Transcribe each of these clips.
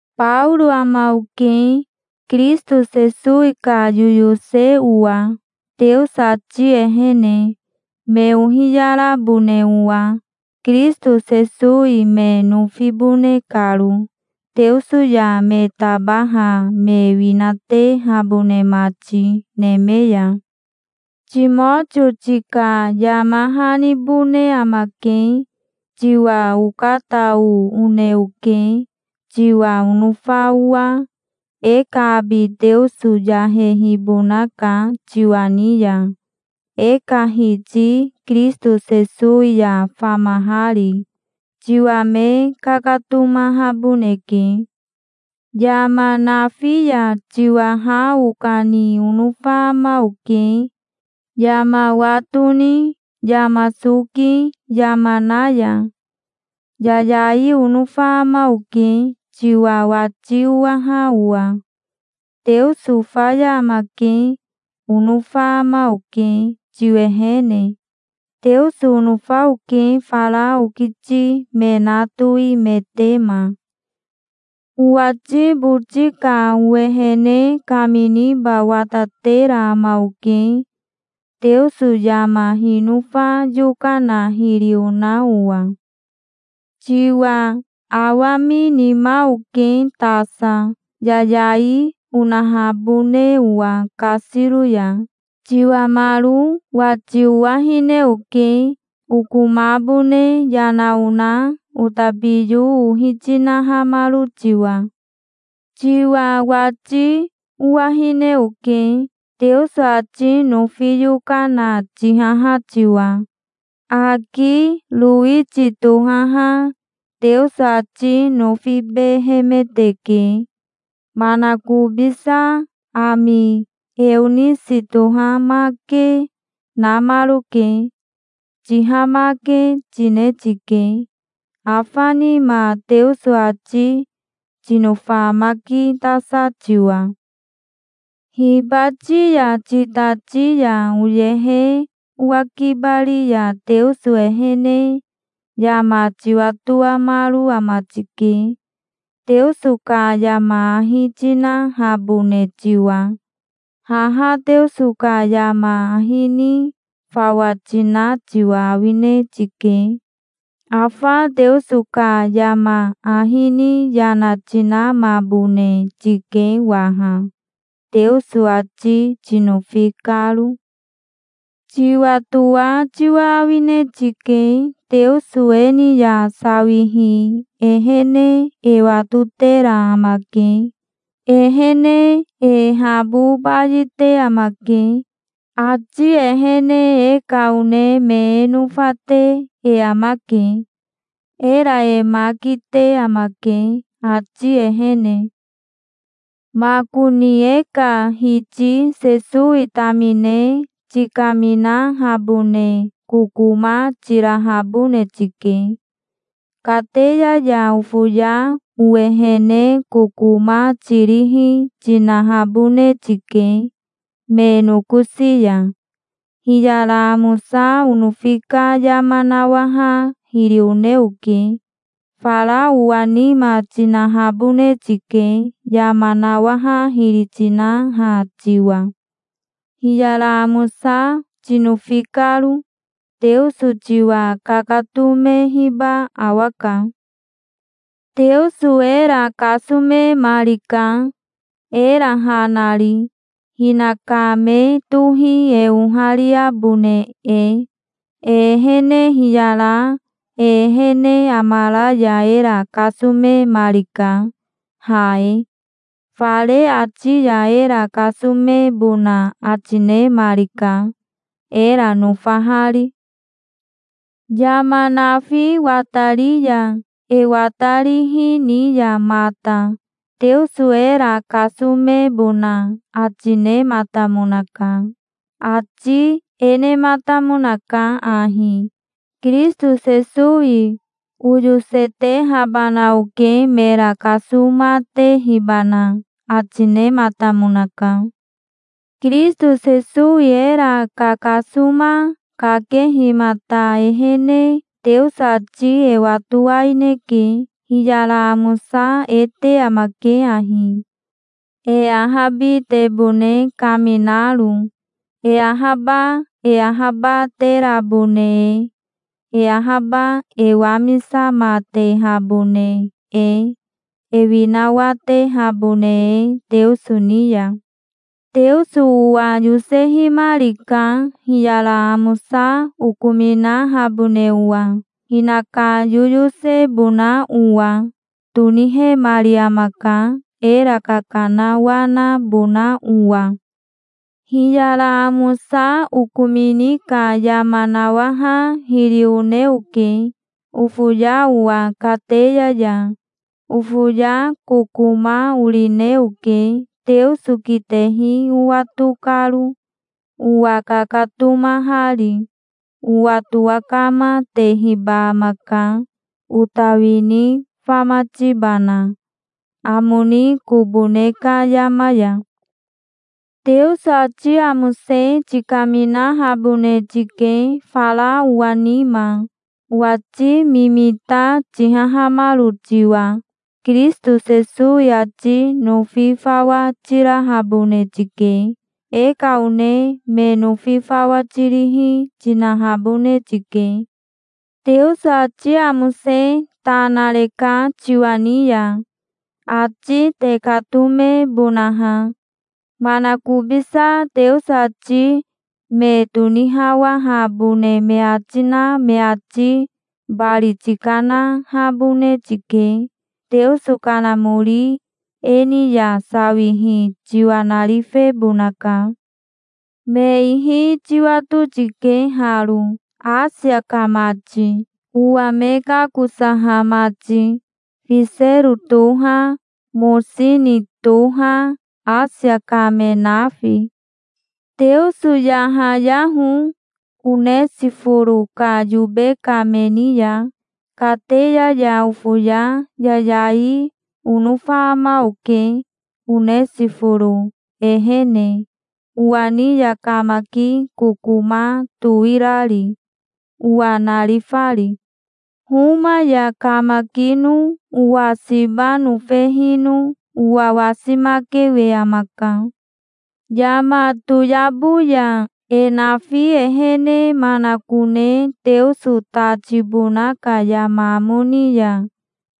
Baoro ama oke, Kirisito Sesowi ka yoyose owa, Teoso ati ehene, me ohiyarabone owa, Kirisito Sesowi me nofibone karo, Teoso ya me tabaha me winatehabone mati neme ya. Timotio tika yama hanibone amake. Tiwa okatao one oke, tiwa onofa owa. E ka abi Teoso yahehibonaka tiwa ni ya, e ka Hiti Kirisito Sesowi ya famahari. Tiwa me kakatomahaboneke. Yama nafi ya tiwa ha okani onofa ama oke, yama wa toni, yama soki, yama na ya. Yayai onofa ama oke, tiwa wati owaha owa. "Teoso faya amake", onofa ama oke, tiwehene. Teoso onofa oke, fara okiti me na toimetema. Owati boti ka owehene kaminiba watatera ama oke, Teoso yama hinofa yokana hiri ona owa. Tiwa awaminima oke tasa, yayai onahabone owa kasiro ya. Tiwamaro wati owahine oke, okomabone yana ona otabiyo ohi tinahamaro tiwa. Tiwa wati owahine oke, Teoso ati nofi yokana tihaha tiwa. Aki Rowiti tohaha Teoso ati nofibehemeteke. Manakobisa ami Eonisi tohamake, namaroke. Tihamake tine tike, afa nima, Teoso ati tinofamakitasa tiwa. Hibati ya titati ya oyehe owakibari ya Teoso ehene yama tiwatoamaro ama tike, Teoso ka yama ahi tinahabone tiwa. Haha Teoso ka yama ahi ni fawa tina tiwa awine tike. Afa Teoso ka yama ahi ni yana tinamabone tike waha, Teoso ati tinofi karo. Tiwatoa tiwa awine tike. Teoso e ni ya sawihi ehene e watotera amake. Ehene e habo bayite amake. Ati ehene e ka one me e nofate e amake. Era e ma kite amake, ati ehene. Makoni e ka Hiti Sesowi tamine tikaminahabone kokoma tirahabone tike. Kateya ya ofoya owehene kokoma tirihi tinahabone tike me nokosi ya. Hiyara amosa onofi ka yama nawaha hiri one oke. Fara owa nima tinahabone tike, yama nawaha hiri tinaha tiwa, hiyara amosa tinofi karo. Teoso tiwa kakatomehiba awaka. Teoso era kasomemarika, era ha nari, hinaka me tohi e ohariabone e. E ehene hiyara e ehene amara ya era kasomemarika, ha e. Fare ati ya era kasomebona ati nemarika, era nofahari. Yama nafi watari ya, e watarihi, ni ya mata Teoso era kasomebona ati nematamonaka. Ati e nematamonaka ahi: "Kirisito Sesowi oyosetehabana oke, mera kasomatehibana", ati nematamonaka. Kirisito Sesowi era kakasoma kakehimata ehene Teoso ati e watowaineke. Hiyara amosa e te amake ahi, e ahabitebone kaminaro, e ahaba e ahabaterabone e, e ahaba e wamisamatehabone e, e winawatehabone e, Teoso ni ya. Teoso owa yosehimarika, hiyara amosa okominahabone owa. Hinaka yoyosebona owa tonihemari amaka, era kakanawanabona owa. Hiyara amosa okomini ka yama nawaha hiri one oke, ofoya owa kateya ya. Ofoya kokoma orine oke, Teoso kitehi owato karo, owa kakatomahari. Owa towakamatehiba amaka, ota wini famatibana, amo ni kobo ne ka yama ya. Teoso ati amose tikaminahabone tike, fara owa nima, owati mimita tihahamaro tiwa. Kirisito Sesowi ati nofi fawa tirahabone tike. E ka one me nofi fawa tirihi, tinahabone tike. Teoso ati amose ta nareka tiwa ni ya, ati tekatomebonaha. Manakobisa Teoso ati me tonihawahabone me ati na me ati bari tikanahabone tike. Teoso Kanamori e ni ya sawihi tiwa narifebonaka. Me ihi tiwato tike haro, Asia ka mati, owa me kakosaha mati. Fisero toha, Mosini toha, Asia ka me nafi. Teoso yahayaho Onesiforo ka yobe ka me ni ya. Kateya ya ofoya yayai onofa ama oke Onesiforo ehene, owa ni ya kamaki kokoma towi rari, owa narifari. Homa ya kamakino owa siba nofehino owa wasimakewe amaka. Yama toyabo ya, e nafi ehene manakone Teoso ta tibona ka yama amo ni ya,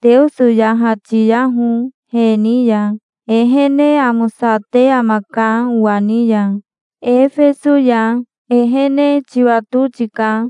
Teoso yahatiyaho he ni ya. Ehene amosate amaka owa ni ya, Efeso ya. Ehene tiwato tika.